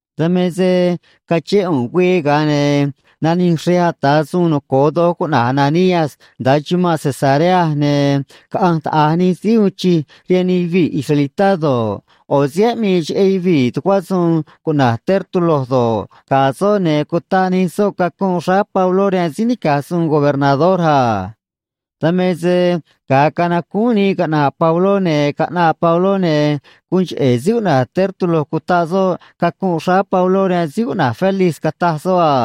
Dan me se cachén ꞌu̱nꞌ güii, ga̱a ne̱ nanij xrej ata̱ suun noco̱o doj cuꞌna̱j Ananías nda̱a chumanꞌ Cesarea, ne̱ caꞌanj taꞌa̱j nij síí uun chij rihaan nij yuvii̱ israelitá do̱ꞌ, ꞌo̱ síí aꞌmii cheꞌé yuvii̱ tucuá suun cuꞌna̱j Tértulo do̱ꞌ, ga̱ soꞌ, ne̱ cutaꞌ nij soꞌ cacunꞌ xráá Pabló rihaan síí nica̱j suun gobernador a. Dan me se ga̱a canacúún nii caꞌna̱ꞌ Pabló, ne̱ caꞌnaꞌ Pabló, ne̱ guun cheꞌe̱ síí cuꞌna̱j Tértulo cutaꞌ soꞌ cacunꞌ xráá Pabló rihaan síí cuꞌna̱j Félix, cataj soꞌ a: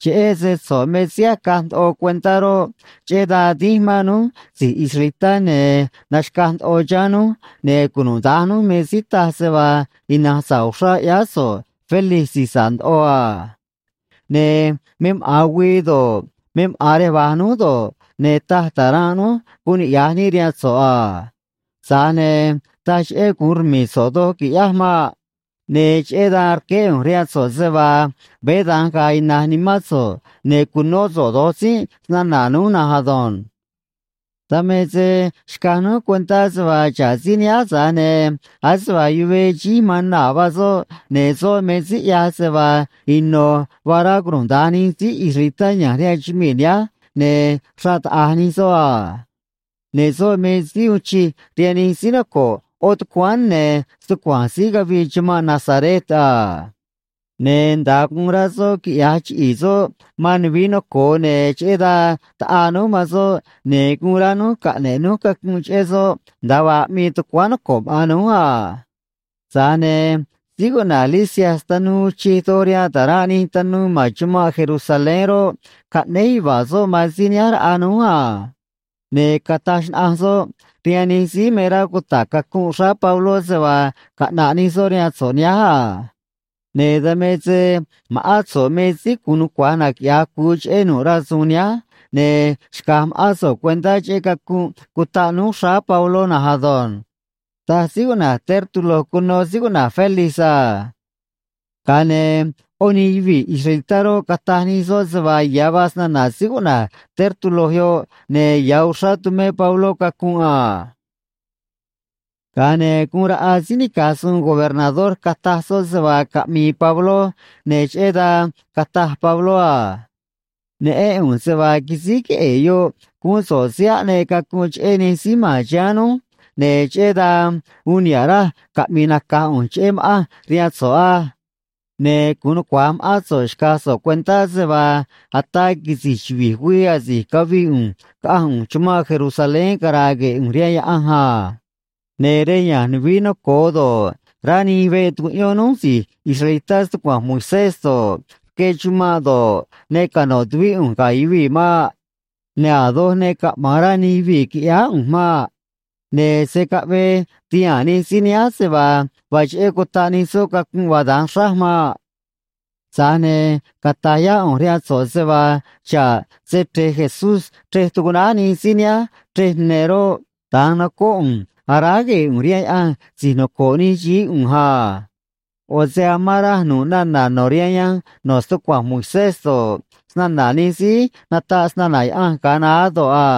―Cheꞌé se so̱ꞌ me síí acaj ndoꞌo cuentá roꞌ, cheꞌé dan dínj mán núj si̱j israelitá, ne̱ naxca̱j ndoꞌo chiháán núj, ne̱ cunuda̱nj núj me síí taj se vaa ina̱nj sa̱ꞌ uxrá ꞌyáá so̱ꞌ, Félix si̱j sa̱ꞌ ndoꞌo a. Ne̱ me maꞌa̱n güii do̱ꞌ, me maꞌa̱n rej va̱j núj do̱ꞌ, ne̱ taj ta̱ranꞌ núj “Guun niꞌya̱j níꞌ” rihaan so̱ꞌ a. Tza̱j ne̱ taj cheꞌé gu̱un rmi̱i̱ so̱ꞌ doj qui̱ꞌyáj maꞌ. Ne̱ cheꞌé dan rqueé ꞌu̱nj rihaan so̱ꞌ se vaa veé da̱nj ga̱a̱ ina̱j nimán so̱ꞌ, ne̱ cu̱nó so̱ꞌ do̱j tzínꞌ snana̱ núj na̱nj ado̱nj. ’Dan me se xcaj núj cuentá se vaa xa̱ꞌ síí nihánj, tza̱j ne̱ ase vaa yuvee xíj man naa̱ vaa soꞌ, ne̱ soꞌ me síí ꞌyaj se vaa ino̱ vaa rá cunuda̱nj nij síí israelitá ya̱nj rihaan chumii̱ nihánj ne̱ xraꞌ taꞌa̱j nij soꞌ a. Ne̱ soꞌ me síí uun chij rihaan nij síí noco̱ꞌ ꞌo̱ tucuáán ne̱ stucua̱nj síí cavii chumanꞌ Nazaret a. Ne̱ nda̱a guun rá soꞌ quiꞌya̱j chiꞌi̱i̱ soꞌ man nuvií noco̱o, ne̱ cheꞌé dan taꞌaa núj man soꞌ, ne̱ guun rá núj caꞌne̱ꞌ núj cacunꞌ cheꞌé soꞌ nda̱a vaa aꞌmii tucuáán noco̱ꞌ maꞌa̱n núj a. Tza̱j ne̱ síí cuꞌna̱j Lisias tanuu uun chij doj rihaan ta̱ranꞌ nij tanuu ma̱n chumanꞌ Jerusalén roꞌ, caꞌnéj yuva̱a̱ soꞌ man síí nihánj raꞌa núj a. Ne̱ cataj xnaꞌanj soꞌ rihaan nij síí me rá cuta̱ꞌ cacunꞌ xráá Pabló se vaa caꞌna̱ꞌ nij soꞌ rihaan so̱ꞌ nihánj a. Ne̱ dan me se ma̱ꞌán so̱ꞌ me síí gu̱un nucua̱j naquiꞌya̱j cu̱u cheꞌé nu̱ꞌ rasu̱u̱n nihánj, ne̱ xca̱j ma̱ꞌán so̱ꞌ cuentá cheꞌé cacunꞌ cutaꞌ núj xráá Pabló na̱nj ado̱nj ―taj síí cuꞌna̱j Tértulo cuno síí cuꞌna̱j Félix a. Ga̱a ne̱ ꞌó nij yuvii̱ israelitá roꞌ, cataj nij soꞌ se vaa ya̱ vaa snana̱ síí cuꞌna̱j Tértulo yoꞌ ne̱ ya̱ uxrá tumé Pabló cacunꞌ a. Ga̱a ne̱ guun raꞌa síí nica̱j suun gobernador cataj soꞌ se vaa caꞌmi̱i̱ Pabló, ne̱ cheꞌé dan cataj Pabló a: ―Neꞌén ꞌu̱nj se vaa quisíj queꞌe̱e̱ yoꞌ guún so̱ꞌ síí aꞌneꞌ cacunꞌ cheꞌé nij síí ma̱n chiháán núj, ne̱ cheꞌé dan uun niha̱ꞌ raj caꞌmi̱i̱ nacaj ꞌu̱nj cheꞌé ma̱ꞌanj rihaan so̱ꞌ á. Ne̱ gu̱un nucua̱j ma̱ꞌán so̱ꞌ xca̱j so̱ꞌ cuentá se vaa ataa quisi̱j chuvi̱j güii asi̱j cavii ꞌu̱nj caꞌanj ꞌu̱nj chumanꞌ Jerusalén cara̱a̱ gue̱e̱ ꞌu̱nj rihaan Yaꞌanj a. Ne̱ rej ya̱nj nuvií noco̱o do̱ꞌ, rá nij veꞌ tucuꞌyón núj si̱j israelitá stucua̱nj Moisés do̱ꞌ, rque chumanꞌ do̱ꞌ, ne cano̱ tuvíꞌ ꞌu̱nj ga̱ yuvii̱ maꞌ. Ne̱ a̱ doj ne caꞌma̱an rá nij yuvii̱ qui̱ꞌyáá ꞌu̱nj maꞌ. Ne̱ se̱ caꞌvee ti̱haa̱n nij síí nihánj se vaa vaa cheꞌé cutaꞌ nij soꞌ cacunꞌ vaa da̱nj xráj maꞌ. ’Tza̱j ne̱ cata̱j yá ꞌu̱nj rihaan so̱ꞌ se vaa xa̱ꞌ Se‑Chre̱j Jesús, chrej tucuꞌnáj nij síí nihánj chrej ne̱ roꞌ, da̱nj nocóꞌ ꞌu̱nj aráj gue̱e̱ ꞌu̱nj rihaan Yaꞌanj si̱j noco̱ꞌ nij xií ꞌu̱nj a. ꞌO̱ se amán raj nu̱ꞌ nana̱ no̱ rihaan yanj no̱ stucua̱nj Moisés do̱ꞌ, snana̱ nij síí nataꞌ snana̱ Yaꞌanj ga̱a naá do̱ꞌ a.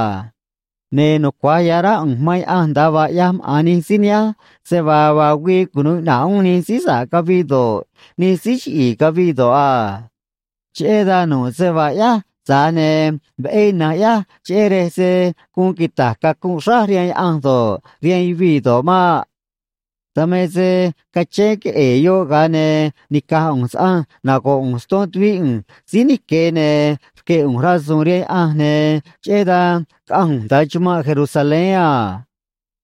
Ne̱ nucua̱j ya̱ rá ꞌu̱nj man Yaꞌanj nda̱a vaa ꞌyaj maꞌa̱n nij síí nihánj se vaa vaa güii cunu̱u iꞌna̱ꞌ uún nij síí sa̱ꞌ caviꞌ do̱ꞌ, nij síí chiꞌi̱i̱ caviꞌ do̱ꞌ a. Cheꞌé dan nu̱ꞌ se vaa ꞌyáj, tza̱j ne̱ veꞌé ina̱nj ꞌyáj cheꞌé rej se̱ guun quita̱j cacunꞌ xráj rihaan Yaꞌanj do̱ꞌ, rihaan yuvii̱ do̱ꞌ maꞌ. ’Dan me se cachén queꞌe̱e̱ yoꞌ, ga̱a ne̱ nica̱j ꞌu̱nj saꞌanj nago̱ꞌ ꞌu̱nj ston tuvíꞌ ꞌu̱nj síí nique̱ ne̱ rque̱ ꞌu̱nj rasu̱u̱n rihaan Yaꞌanj, ne̱ cheꞌé dan caꞌanj ꞌu̱nj nda̱a chumanꞌ Jerusalén a.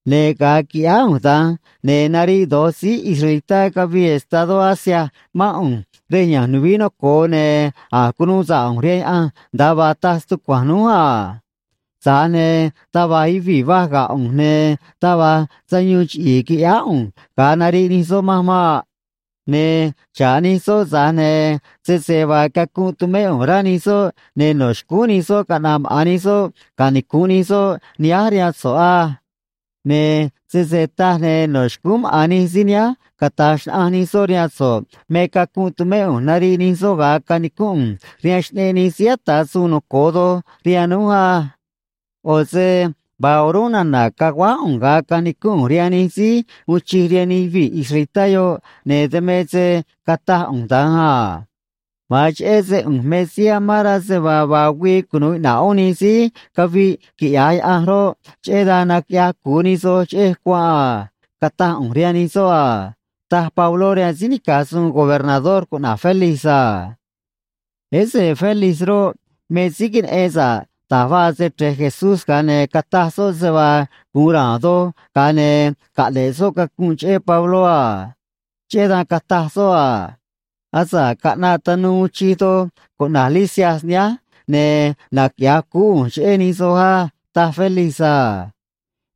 Ne̱ ga̱a quiꞌyáá ꞌu̱nj da̱nj, ne̱ nariꞌ do̱j síí israelitá cavii estadó Asia mán ꞌu̱nj rej ya̱nj nuvií noco̱o, ne̱ a̱j cunuu sa̱ꞌ ꞌu̱nj rihaan Yaꞌanj nda̱a vaa taj stucua̱nj núj a. Tza̱j ne̱ taj va̱j yuvii̱ va̱j ga̱ ꞌu̱nj, ne̱ taj va̱j sayuun chiꞌi̱i̱ quiꞌyáá ꞌu̱nj ga̱a nariꞌ nij soꞌ manj maꞌ. Ne̱ xa̱ꞌ nij soꞌ, tza̱j ne̱ sese vaa cacunꞌ tumé ꞌu̱nj rá nij soꞌ, ne̱ no̱ xcúún nij soꞌ caꞌna̱ꞌ maꞌa̱n nij soꞌ canicu̱nꞌ nij soꞌ nihánj rihaan so̱ꞌ á. Ne̱ sese taj, ne̱ no̱ xcúún maꞌa̱n nij síí nihánj cata̱j xnaꞌanj nij soꞌ rihaan so̱ꞌ me cacunꞌ tumé ꞌu̱nj nariꞌ nij soꞌ ga̱a canicúnꞌ ꞌu̱nj rihaan Xꞌneꞌ Nij Síí Ata̱ Suun Noco̱o Doj rihaan núj á. ꞌO̱ se vaa o̱rúnꞌ nana̱ caguáj ꞌu̱nj ga̱a canicúnꞌ ꞌu̱nj rihaan nij síí uun chij rihaan nij yuvii̱ israelitá yoꞌ, ne̱ dan me se cataj ꞌu̱nj da̱nj a: “Ma̱an cheꞌé se ꞌu̱nj me síí amán rá se vaa vaa güii cunu̱u iꞌna̱ꞌ uún nij síí caviꞌ quiꞌya̱j Yaꞌanj roꞌ, cheꞌé dan naquiꞌyaj cu̱u nij soj cheꞌej cuanꞌ a”, cataj ꞌu̱nj rihaan nij soꞌ a ―taj Pabló rihaan síí nica̱j suun gobernador cuꞌna̱j Félix a. Ese Félix roꞌ, me síí queneꞌen sa̱ꞌ da̱j vaa Se‑Chre̱j Jesús, ga̱a ne̱ cataj soꞌ se vaa gu̱un ra̱a̱n doj, ga̱a ne̱ caꞌne̱ꞌ soꞌ cacunꞌ cheꞌé Pabló a. Cheꞌé dan cataj soꞌ a: ―Asa̱ꞌ caꞌnaꞌ tanuu uun chij doj cuꞌna̱j Lisias nihánj, ne̱ naquiꞌya̱j cuú ꞌu̱nj cheꞌé nij soj á ―taj Félix a.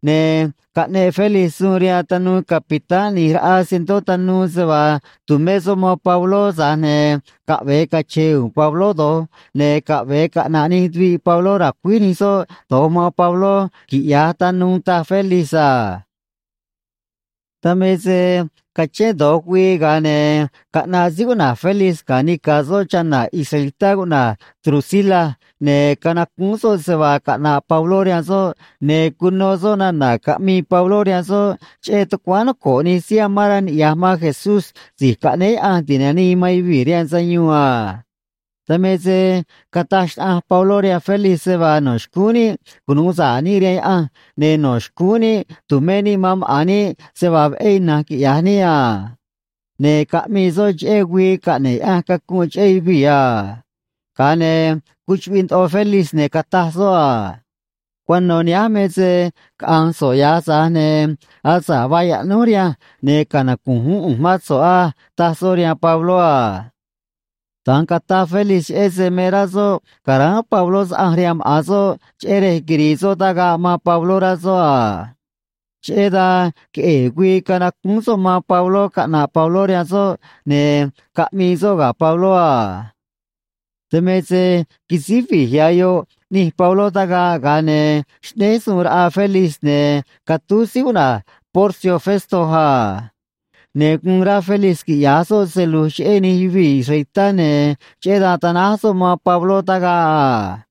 Ne̱ caꞌneꞌ Félix suun rihaan tanuu capitán ꞌni̱j raꞌa cientó tanuu se vaa tu̱mé soꞌ man Pabló, tza̱j ne̱ caꞌve̱e cache̱e̱ u̱u̱n Pabló do̱j, ne̱ caꞌve̱e caꞌna̱ꞌ nij tuviꞌ Pabló ra̱cuíj nij soꞌ do̱j man Pabló, quiꞌya̱j tanuu, taj Félix a. Dan me se cachén do̱j güii, ga̱a ne̱ caꞌnaꞌ síí cuꞌna̱j Félix ga̱ nica̱ soꞌ chana̱ israelitá cuꞌna̱j Drusila, ne̱ canacúún soꞌ se vaa caꞌna̱ꞌ Pabló rihaan soꞌ, ne̱ cuno soꞌ nana̱ caꞌmii Pabló rihaan soꞌ cheꞌé tucuáán noco̱ꞌ nij síí amán rá niꞌya̱j man Jesús Si̱j Caꞌnéé Yaꞌanj Ti̱nanii man Yuvii̱ rihaan Sayuun a. Dan me se cataj xnaꞌanj Pabló rihaan Félix se vaa no̱ xcúún níꞌ cunu̱u sa̱ꞌ níꞌ rihaan Yaꞌanj ne̱ no̱ xcúún níꞌ tu̱mé níꞌ man maꞌa̱n níꞌ se vaa veꞌé ina̱nj quiꞌya̱j níꞌ a. Ne̱ caꞌmii soꞌ cheꞌé güii caꞌne̱ꞌ Yaꞌanj cacunꞌ cheꞌé yuvii̱ a. Ga̱a ne̱ cuchuꞌviꞌ ndoꞌo Félix, ne̱ cataj soꞌ a: ―Cuano̱ nihánj me se caꞌa̱nj so̱ꞌ ya̱j, tza̱j ne̱ asa̱ꞌ vaa yaꞌnúj rihanj, ne̱ canacu̱nj uún ꞌu̱nj mán so̱ꞌ á ―taj soꞌ rihaan Pabló a. Da̱nj cataj Félix cheꞌé se me rá soꞌ ca̱ráán Pabló saꞌanj rihaan maꞌa̱n soꞌ cheꞌé rej quiri̱i̱ soꞌ tagaꞌ man Pabló, rá soꞌ a. Cheꞌé dan queꞌe̱e̱ güii canacúún soꞌ man Pabló caꞌna̱ꞌ Pabló rihaan soꞌ, ne̱ caꞌmii soꞌ ga̱ Pabló a. Dan me se quisíj vi̱j ya̱ yoꞌ ꞌni̱j Pabló tagaꞌ, ga̱a ne̱ xꞌnéj suun raꞌa Félix, ne̱ catúj síí cuꞌna̱j Porcio Festo a. Ne̱ guun rá Félix quiꞌya̱j soꞌ se lu̱j cheꞌé nij yuvii̱ israelitá, ne̱ cheꞌé dan tanáj soꞌ man Pabló tagaꞌ a.